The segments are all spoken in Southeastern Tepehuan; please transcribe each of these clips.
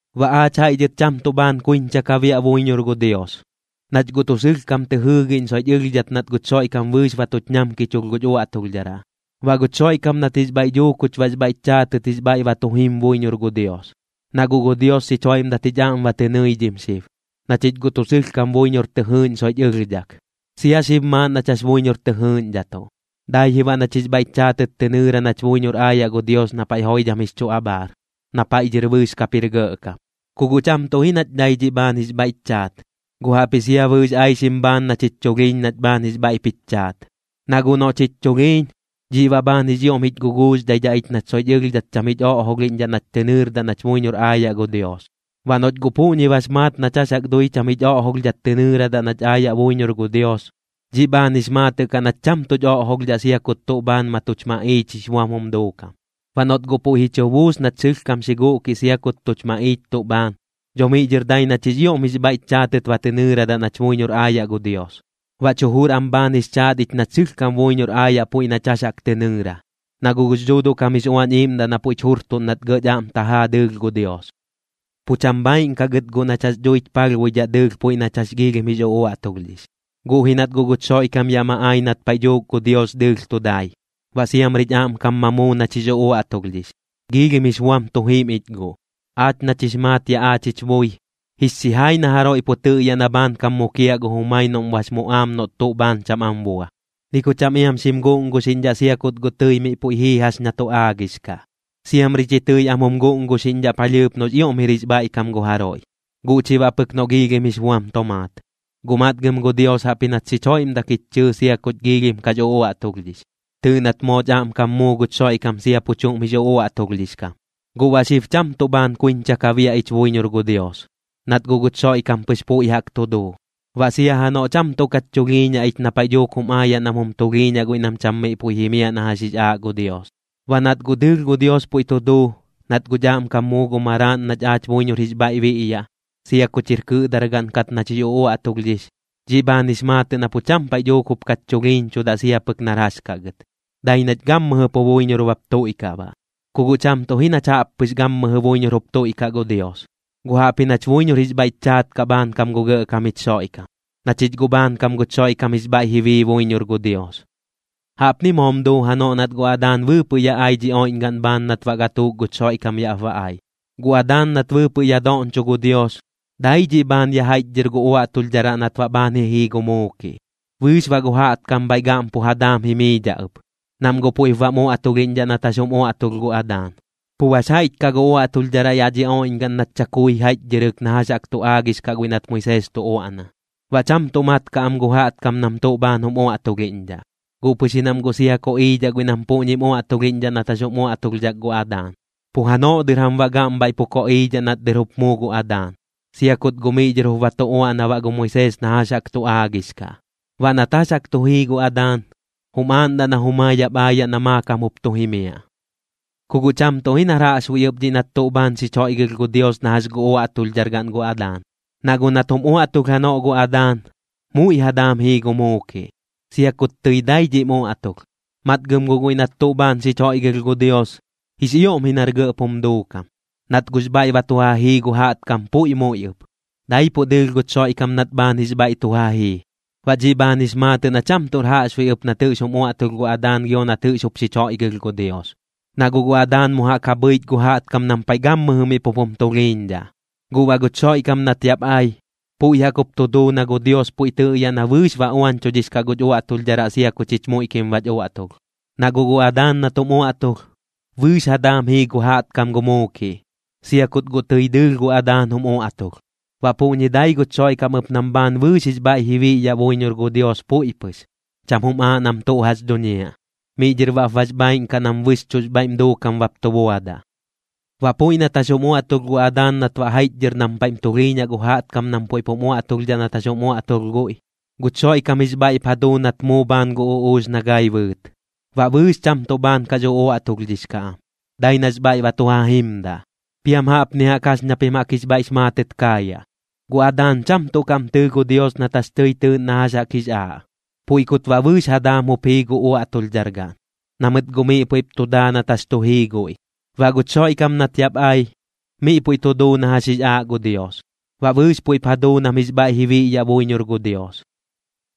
Baꞌ aach jaiꞌ dhɨt cham tuꞌ bhaan kuiñcha ka biaꞌ buiñor gu Dios, nach guꞌ tuꞌ sɨlhkam tɨ jɨɨgiꞌñ soiꞌch ɨlhdhat nat guch Xoiꞌkam bɨɨx ba tuch ñamkichulh guch uaꞌtulhdharaꞌ. Baꞌ guch Xoiꞌkam nat jix bhaiꞌ dhuu kuch baꞌx bhaiꞌch chaatɨt jix bhaiꞌ ba tu jim buiñor gu Dios, na guꞌ gu Dios xich joiꞌmdat jich aꞌm ba tɨ nɨidhim xib, na chich guꞌ tuꞌ sɨlhkam buiñor tɨ jɨɨꞌñ soiꞌch ɨlhdhak. Sia xib maaꞌn nach jax buiñor tɨ jɨɨꞌñdhatuꞌ, dai ji baꞌ nach jix bhaiꞌch chaatɨt tɨ nɨɨra nach buiñor aayaꞌ gu Dios na paiꞌ joidham jix chu abhaar, na paiꞌ dhɨr bɨɨx kap jir gɇꞌkam. Ku guꞌ cham tuꞌ ji nach dai dhiꞌ bhaan jix bhaiꞌch chaat, guꞌ jaꞌpji sia bɨɨx aixim bhaan nach jich chulhiiñ nach bhaan jix bhaiꞌp jich chaat. Na guꞌ noꞌch jich chulhiiñ, dhiꞌ baꞌ bhaan jix ioꞌm jich guguuxdhaidhaꞌ ich nach soiꞌch ɨlhdhat cham jich oꞌjolhiꞌñdhaꞌ nach tɨ nɨɨrdaꞌ nach buiñor aayaꞌ gu Dios. Baꞌ noꞌch guꞌ puꞌñi bax maat nach jax jaꞌk dui cham jich oꞌjolhdhat tɨ nɨɨradaꞌ nach aayaꞌ buiñor gu Dios, dhiꞌ bhaan jix maatɨꞌ kaꞌ nach cham tuꞌch oꞌjolhdhaꞌ sia kut tuꞌ bhaan ma tuch maꞌiich jix buam jum duukam. Baꞌ noꞌt guꞌ puiꞌ ji chu buus nach sɨlhkam xi guꞌkiꞌ sia kut tuch maꞌiich tuꞌ bhaan, dho miꞌ dhɨr dai nach jix ioꞌm jix bhaiꞌch chaatɨt ba tɨ nɨɨradaꞌ nach buiñor aayaꞌ gu Dios. Baꞌch jujur am bhaan jix chaat ich nach sɨlhkam buiñor aayaꞌ puiꞌ nach jax jaꞌk tɨ nɨɨra, na guꞌ gux Dhuuduꞌ kam jix Uañ Iiꞌmdaꞌ na puiꞌch jurtuꞌn nat gɇꞌch aꞌm tajaa dɨɨlh gu Dios. Pu cham bhaaiꞌn kaꞌ gɨt guꞌ nach jax dhuich palhbuidhaꞌ dɨɨlh puiꞌ nach jax giilhim jix uꞌuaꞌtulhdhix, guꞌ ji nat guꞌ guch Xoiꞌkam yaꞌ ma ai nat paiꞌ dhuuk gu Dios dɨɨlh tu dai, baꞌ siamrich aꞌmkam ma muu nach jix uaꞌtulhdhix, giilhim jix buam tu jim ich guꞌ. Aach nach jix maat yaꞌ aach jich bui, jix xijai na jaroiꞌ pu tɨꞌyaꞌ na bhaankam mukiaꞌ gu jumai noꞌm bax muꞌaam noꞌt tuꞌ bhaan cham am bua, ni ku cham iam xim guꞌnguxiꞌñdhaꞌ sia kut guꞌ tɨi miꞌ puiꞌ jii jax na tu aagix kaꞌ. Siamri chi tɨi am jum guꞌnguxiꞌñdhaꞌ palhɨɨp noꞌx ioꞌm jir jix bhaiꞌkam gu jaroiꞌ, guꞌ chi baꞌ pɨk noꞌ giilhim jix buam tomaat. Guꞌ matgɨm gu Dios jaꞌpji nat xich joiꞌmdak jich chɨɨ sia kuch giilhim kax uꞌuaꞌtulhdhix. Tɨɨꞌ nat mooch aꞌmkam muu guch Xoiꞌkam sia pu chuꞌm jix uꞌuaꞌtulhdhix kam. Guꞌ baꞌ xib cham tuꞌ bhaan kuiñcha ka biaꞌ ich buiñor gu Dios, nat guꞌ guch Xoiꞌkam pɨx puiꞌ jaꞌk tu duu. Baꞌ sia janoꞌ cham tuꞌ kach chulhiiñaꞌ ich na paiꞌ dhuuk jum aayaꞌ nam jum tulhiiñaꞌ guiꞌ nam cham miꞌ puiꞌ jimiaꞌ na jax jix aaꞌ gu Dios. Baꞌ nat guꞌ dɨɨlh gu Dios puiꞌ tu duu, nat guꞌch aꞌmkam muu gu Maraaꞌn nach aach buiñor jix bhaiꞌ biꞌyaꞌ, sia kuch jir kɨꞌdargaꞌn kat nach jix uꞌuaꞌtulhdhix, dhiꞌ bhaan jix maatɨꞌ na pu cham paiꞌ dhuuk jup kach chulhiiñchudaꞌ sia pɨk nar jax kaꞌ gɨt, dai nach gammɨjɨ pu buiñor bap tuiꞌkaꞌ baꞌ. Ku guꞌ cham tuꞌ ji nach jaꞌp pɨx gammɨjɨ buiñor jup tuiꞌkaꞌ gu Dios, guꞌ jaꞌpji nach buiñor jix bhaiꞌch chaat kaꞌ bhaankam gu Gɇꞌkam jich Xoiꞌkam, na chich guꞌ bhaankam guch Xoiꞌkam jix bhaiꞌ ji bii buiñor gu Dios. Jaꞌpni moom duu janoꞌ nat gu Adaan bɨɨpɨꞌ yaꞌ ai dhi oiꞌñgaꞌn bhaan nat baꞌ gatuuk guch Xoiꞌkam yaꞌp ba ai. Gu Adaan nat bɨɨpɨꞌ yaꞌ doꞌñcho gu Dios, dai dhiꞌ bhaan ya jaiꞌchdhɨr gu uaꞌtulhdharaꞌ nat baꞌ bhaan ji jii gu muukiꞌ, bɨɨx baꞌ gu jaꞌtkam bhaiꞌ gaꞌm pu ja daam jimiidhaꞌ ɨp, nam guꞌ puiꞌp bam uaꞌtulhiꞌñdhaꞌ nat jax jum uaꞌtulh gu Adaan. Pu bax jaiꞌch kaꞌ gu uaꞌtulhdharaꞌ yaꞌ dhi oiꞌñgaꞌn nat chakui jaiꞌchdhɨrɨk na jax jaꞌk tu aagix kaꞌ guiꞌ nat Moisees tu uaꞌna, baꞌ cham tuꞌ mat kaꞌ am gu jaꞌtkam nam tuꞌ bhaan jum uaꞌtulhiꞌñdhaꞌ. Guꞌ pɨx ji nam guꞌ sia koꞌiidhaꞌ guiꞌ nam puꞌñim uaꞌtulhiꞌñdhaꞌ nat jax jum uaꞌtulhdhak gu Adaan, pu janoꞌ dɨr jam baꞌ gaꞌm bhaiꞌ pu koꞌiidhaꞌ nat dɨr jup muu gu Adaan, sia kut guꞌ miꞌ dhɨr jup ba tu uaꞌna baꞌ gu Moisees na jax jaꞌk tu aagix kaꞌ. Baꞌ nat jax jaꞌk tu jii gu Adaan, jum aaꞌndaꞌ na jumai yaꞌp aayaꞌ na maakam jup tu jimiaꞌ. Ku guꞌ cham tuꞌ ji nar jaꞌxbuiꞌ ɨp dhiꞌ nat tuꞌ bhaan xich joiꞌgɨlh gu Dios na jax gu uaꞌtulhdargaꞌn gu Adaan, na guꞌ nat jum uaꞌtulh janoꞌ gu Adaan, muiꞌ ja daam jii gu muukiꞌ, sia kut tɨi dai dhiꞌm uaꞌtulh. Matgɨm guꞌ guiꞌ nat tuꞌ bhaan xich joiꞌgɨlh gu Dios, jix ioꞌm ji nar gɇꞌp jum duukam, nat guꞌx bhaiꞌ ba tu ja jii gu jaꞌtkam puiꞌ muiꞌ ɨp, daipuꞌ dɨɨlh guch Xoiꞌkam nat bhaan jix bhaiꞌ tu ja jii. Baꞌ dhiꞌ bhaan jix maatɨꞌ na cham tuꞌr jaꞌxbuiꞌ ɨp nat jɨꞌx jum uaꞌtulh gu Adaan gio nat jɨꞌx jup xich joiꞌgɨlh gu Dios. Na guꞌ gu Adaan mu jaꞌk ja bhɨich gu jaꞌtkam nam paiꞌ gammɨjɨ miꞌ pup jum tulhiiñdhaꞌ, guꞌ baꞌ guch Xoiꞌkam nat yaꞌp ai, puiꞌ jaꞌk jup tu duu na gu Dios puiꞌ tɨꞌyaꞌ na bɨɨx ba uañchudhix kaꞌ guch uaꞌtulhdharaꞌ sia ku chich muiꞌkim bach uaꞌtulh. Na guꞌ gu Adaan nat jum uaꞌtulh, bɨɨx ja daam jii gu jaꞌtkam gu muukiꞌ, sia kut guꞌ tɨi dɨɨlh gu Adaan jum uaꞌtulh. Baꞌ puꞌñi dai guch Xoiꞌkam ɨp nam bhaan bɨɨx jix bhaiꞌ ji biꞌyaꞌ buiñor gu Dios puiꞌ pɨx, cham jum aaꞌ nam tuꞌ jax dhuñiaꞌ. Miꞌ dhɨr baꞌp bax bhaaiꞌn kaꞌ nam bɨxchuꞌx bhaiꞌm duukam bap tu buadaꞌ. Baꞌ puiꞌ nat jax jum uaꞌtulh gu Adaan nat baꞌ jaiꞌchdhɨr nam paiꞌm tulhiiñaꞌ gu jaꞌtkam nam puiꞌp jum uaꞌtulhdhaꞌ nat jax jum uaꞌtulh guiꞌ, guch Xoiꞌkam jix bhaiꞌp ja duu nat muu bhaan gu uꞌuux na gai bɨɨt. Baꞌ bɨɨx cham tuꞌ bhaan kax uꞌuaꞌtulhdhix kaꞌ am, dai nax bhaiꞌ ba tu ja jimdaꞌ. Piam jaꞌpni jaꞌk jax ña pim jaꞌk jix bhaiꞌx maatɨt kaayaꞌ: Gu Adaan cham tuꞌ kaꞌm tɨɨ gu Dios nat jax tɨi tɨɨꞌn na jax jaꞌk jix aaꞌ. Puiꞌ kut baꞌ bɨɨx ja daam jup jii gu uaꞌtulhdhargaꞌn, na mɨt guꞌ miꞌ puiꞌp tu daa nat jax tu jii guiꞌ. Baꞌ guch Xoiꞌkam nat yaꞌp ai, miꞌ puiꞌ tu duu na jax jix aaꞌ gu Dios, baꞌ bɨɨx puiꞌp ja duu nam jix bhaiꞌ ji biꞌyaꞌ buiñor gu Dios.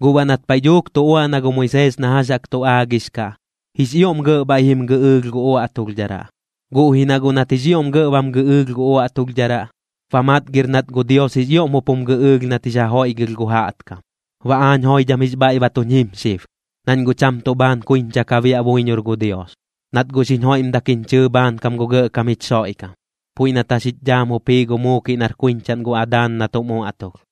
Guꞌ baꞌ nat paiꞌ dhuuk tu uaꞌna gu Moisees na jax jaꞌk tu aagix kaꞌ, jix ioꞌm gɇꞌ bhaiꞌ jim gɨꞌɨɨlh gu uaꞌtulhdharaꞌ. Guꞌ ji na guꞌ nat jix ioꞌm gɇꞌ bam gɨꞌɨɨlh gu uaꞌtulhdharaꞌ, ba matgir nat gu Dios jix ioꞌm jup jum gɨꞌɨɨlh nat jix ja joiꞌgɨlh gu jaꞌtkam. Baꞌ aañ joidham jix bhaiꞌ ba tuñ jim xib, nañ guꞌ cham tuꞌ bhaan kuiñcha ka biaꞌ buiñor gu Dios, nat guꞌ xiñ joiꞌmdak jiñ chɨɨ bhaankam gu Gɇꞌkam jich Xoiꞌkam, puiꞌ nat jax jich dhaam jup jii gu muukiꞌ nar kuiñchaꞌn gu Adaan nat jum uaꞌtulh.